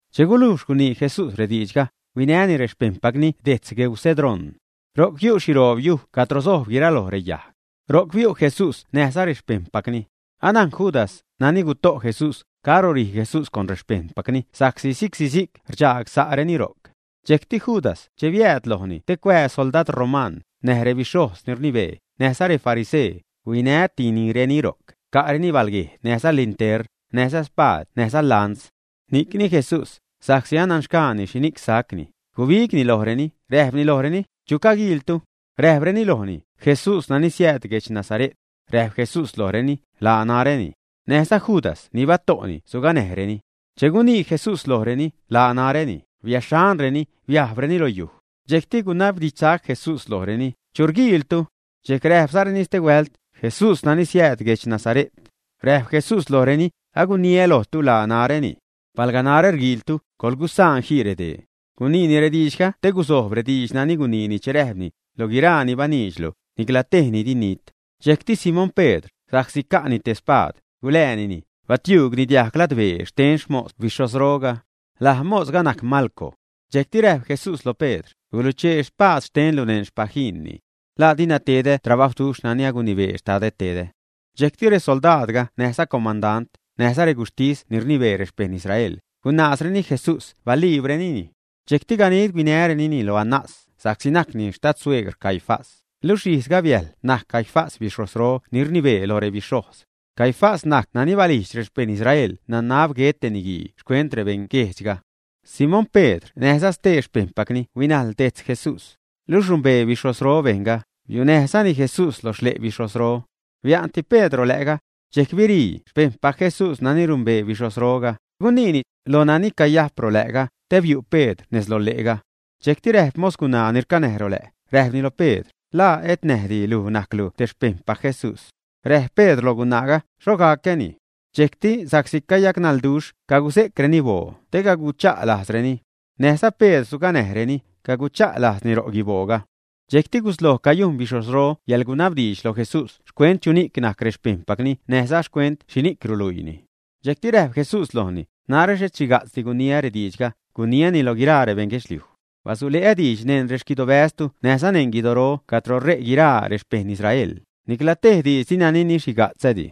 Che gulujx gunii Jesús rediidxga, huinäni rexpejṉpacni dejtz gueu Cedrón. Ro'c yu' xhiroob yuj cadro sojb guiraloj reyajg. Ro'c biu' Jesús näjza rexpejṉpacni. Anajn Judas, nani guto' Jesús, caro rij Jesús con rexpejṉpacni sa'csi si'csi-si'c rdxaag sa'reni ro'c. Dxejcti Judas, che biääd lojni te cuaa soldad roman, näj rebixhojz ni rnibee, näjza refarisee, huinätinireni ro'c, ca'reni balguejd näjza lintern, näjza spaad näjza lans. Ni'cni Jesús, sa'csi ananxgaani xhini'c sacni, gubigni lojreni, räjpni lojreni: ―¿Chu rguiiltu? Räjpreni lojni: ―Jesús nani siääd guedx Nazare't. Räjp Jesús lojreni: ―Laa naräni. Näjza Judas ni bato'ni suganäjnireni. Che gunii Jesús lojreni: “Laa naräni”, biäxhanreni, biajbreni lo yuj. Dxejcti gunabdidxsac Jesús lojreni: ―¿Chu rguiiltu? Dxejc räjpzareni stehuält: ―Jesús nani siääd guedx Nazare't. Räjp Jesús lojreni: ―Aguniä lojtu, laa naräni. Palga narä rguiiltu, coḻgusaan jii redee. Guniini rediidxga te gusojb rediidx nani guniini che räjpni: “Loj guiraa ni baniidxlu, nicla tejni di ninijt.” Dxejcti Simón Pedr, sa'csi ca'ni te spaad, guläänini, batiuugni diag ladbee xten xmos bixhojzroga. Laj mosga najc Malco. Dxejcti räjp Jesús lo Pedr: ―Guluchee spaad xtenlu neṉ xpaguinni. ¿La dina tedä trabajwduxh nani agunibee Xtadä tedä, ä? Dxejcti resoldaadga näjza comandant, näjza reguxhtis ni rnibee rexpejṉ Israel, guṉaazreni Jesús baliibrenini. Dxejcti ganid huinärenini lo Anás, sa'csi najcni xtadsueegr Caifás, luxh ijzga biäjl najc Caifás bixhojzro ni rnibee lo rebixhojz. Caifás najc nani balijdx rexpejṉ Israel nanab guet te niguii xcuent rebeṉguejdxga. Simón Pedr näjza stee xpejṉpacni huinajl dejtz Jesús. Luxh numbee bixhojzro bejṉga, biunäjzani Jesús lo xle' bixhojzro. Bia'nti Pedr rolä'ga. Dxejc birii xpejṉpac Jesús nani numbee bixhojzroga, guniini lo nani cayajp rolä'ga, te biu' Pedr nez lo le'ga. Dxejcti räjp mos gunaa ni rcanäj rolä', räjpni lo Pedr: ―¿La et näjdi luj najclu te xpejṉpac Jesús, ä? Räjp Pedr loj gunaaga: ―¡Xho gacäni! Dxejcti sa'csi cayacnalduxh, caguse'creni boo te cagucha'lajzreni. Näjza Pedr suganäjreni, cagucha'lajzni ro guibooga. Dxejcti gusloj cayujn bixhojzro yäḻgunabdiidx loj Jesús xcuent chuni'c najc rexpejṉpacni näjza xcuent xhini'c ruluiini. Dxejcti räjp Jesús lojni: ―Narä xhet xhiga'tzdi guniä rextidxä, guniäni lo guiraa rebejṉ guedxliuj. Basule'ä diidx neṉ rexquidobäztu näjza neṉ guidoro cadro re' guiraa rexpejṉ Israel, nicla tej diidx dina ninixhiga'tzädi.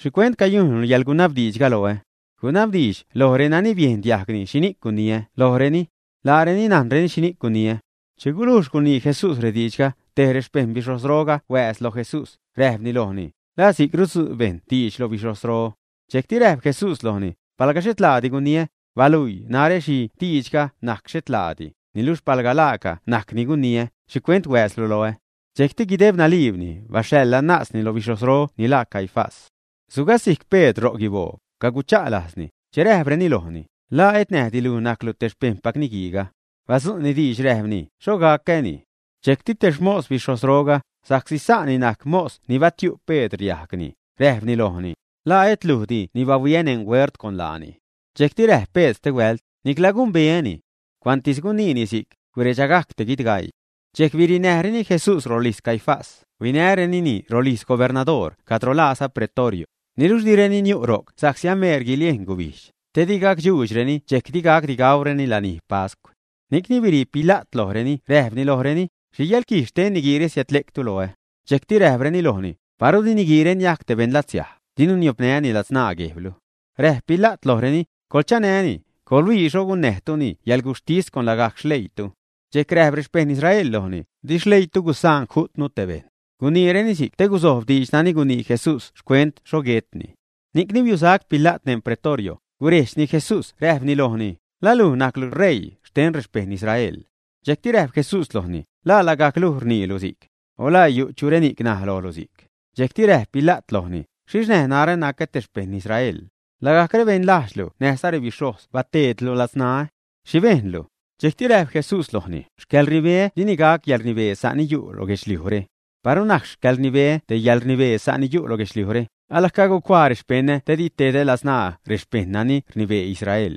¿Xhicuent cayujnlu yäḻgunabdiidxga loä? Gunabdiidx loj renani biejn diajg xhini'c guniä lojreni. Laareni najnreni xhini'c guniä. Che gulujx gunii Jesús rediidxre, te rexpejṉ bixhojzroga huääz loj Jesús, räjpni lojni: ―¿La si'c rudzu' bejṉ diidx loj bixhojzro, ä? Dxejcti räjp Jesús lojni: ―Palga xhet laadi guniä, baluii narä xhi diidxga najc xhet laadi, niluxh palga laaca najc ni guniä, ¿xhicuent huääzlu loä? Dxejcti guideb naliibni baxhaḻ Anásni lo bixhojzro lo ni laa Caifás. Sugasijc Pedr ro' guiboo, cagucha'lajzni, che räjpreni lojni: ―¿La et näjdi luj najclu te xpejṉpac niguiiga, ä? Badzu'ni diidxga räjpni: ―¡Xho gacäni! Dxejcti te xmos bixhojzroga, sa'csi sa'ni najc mos ni batiu' Pedr diajgni, räjpni lojni: ―¿La et lujdi ni bahuiä neṉ huert con laani, ä? Dxejcti räjp Pedr stehuält: ―Nicla gumbeäni. Cuantis guniini si'c, guredxagajc te guidgaii. Dxejc birinäjreni Jesús rolijz Caifás, huinärenini rolijz gubernadoor cadro laaza Pretorio, niluxh direni niu' ro'c sa'csi ameer guiliejn gubijdx, te di gacdxuudxreni dxejc di gacdi gaureni lani pascw. Ni'cni birii Pila't lojreni räjpni lojreni: ―¿Xhi yäḻquij xten niguiire siädle'ctu loä? Dxejcti räjpreni lojni: ―Paru di niguiire niajc te beṉ latsiaj, dinu niopnäni ladzṉaa guejblu. Räjp Pila't lojreni: ―Coḻchanäni, coḻhuii xho gunnäjtuni yäḻguxhtis con lagajc xleiitu. Dxejc räjp rexpejṉ Israel lojni: ―Di xleiitu gusaan ju'tnu te bejṉ. Guniireni si'c te guzojb diidx nani gunii Jesús xcuent xho guetni. Ni'cni biusac Pila't neṉ Pretorio, gurejdxni Jesús räjpni lojni: ―¿La luj najclu ṟeii xten rexpejṉ Israel, ä? Dxejcti räjp Jesús lojni: ―¿La lagajc luj rniilu si'c, ä? O ¿laa yu' chureni'c naj lojlu si'c? Dxejcti räjp Pila't lojni: ―¿Xhixh näj narä nacä te xpejṉ Israel? Lagajc rebeṉ lajdxlu näjza rebixhojz bateedlu ladzṉaä. ¿Xhi bejnlu? Dxejcti räjp Jesús lojni: ―Xcäḻrnibeä dini gac yäḻrnibee sa' ni yu' guedxliujre. Paru najc xcäḻrnibeä te yäḻrnibee sa' ni yu' guedxliujre, ala cagucuaa rexpeṉä te di tedä ladzṉaa rexpejṉ nani rnibee Israel.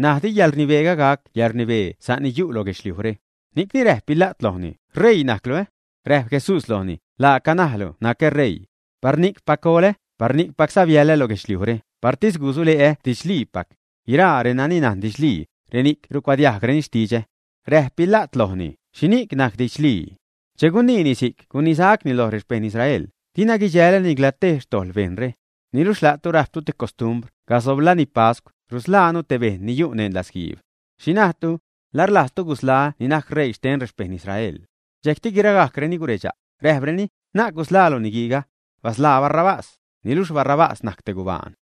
N̲aj di xcäḻrnibeä gac yäḻrnibee sa' ni yu' lo guedxliujre. Ni'cni räjp Pila't lojni: ―¿R̲eii najclu, ä? Räjp Jesús lojni: ―Laaca najlu nacä ṟeii. Par ni'cpac golä, par ni'cpacza biäḻä lo guedxliujre, partis gusule'ä didxliipac. Guiraa renani najn didxlii, reni'c rucuadiajgreni xtidxä. Räjp Pila't lojni: ―¿Xhini'c najc didxlii? Che guniini si'c gunisacni loj rexpejṉ Israel: ―Dina guidxälä nicla tej xtojḻ bejnre. Niluxh la'tu rajptu te costumbr, casob lani pascw, rusḻaanu te bejṉ ni yu' neṉ latzguiib. ¿Xhi najtu? ¿La rlajztu gusḻaä́ ni najc ṟeii xten rexpejṉ Israel, ä? Dxejcti guiragajcreni guredxa', räjpreni: ―¡Na'c gusḻaalu niguiiga! ¡Basḻaa Barrabás! Niluxh Barrabás najc te gubaan.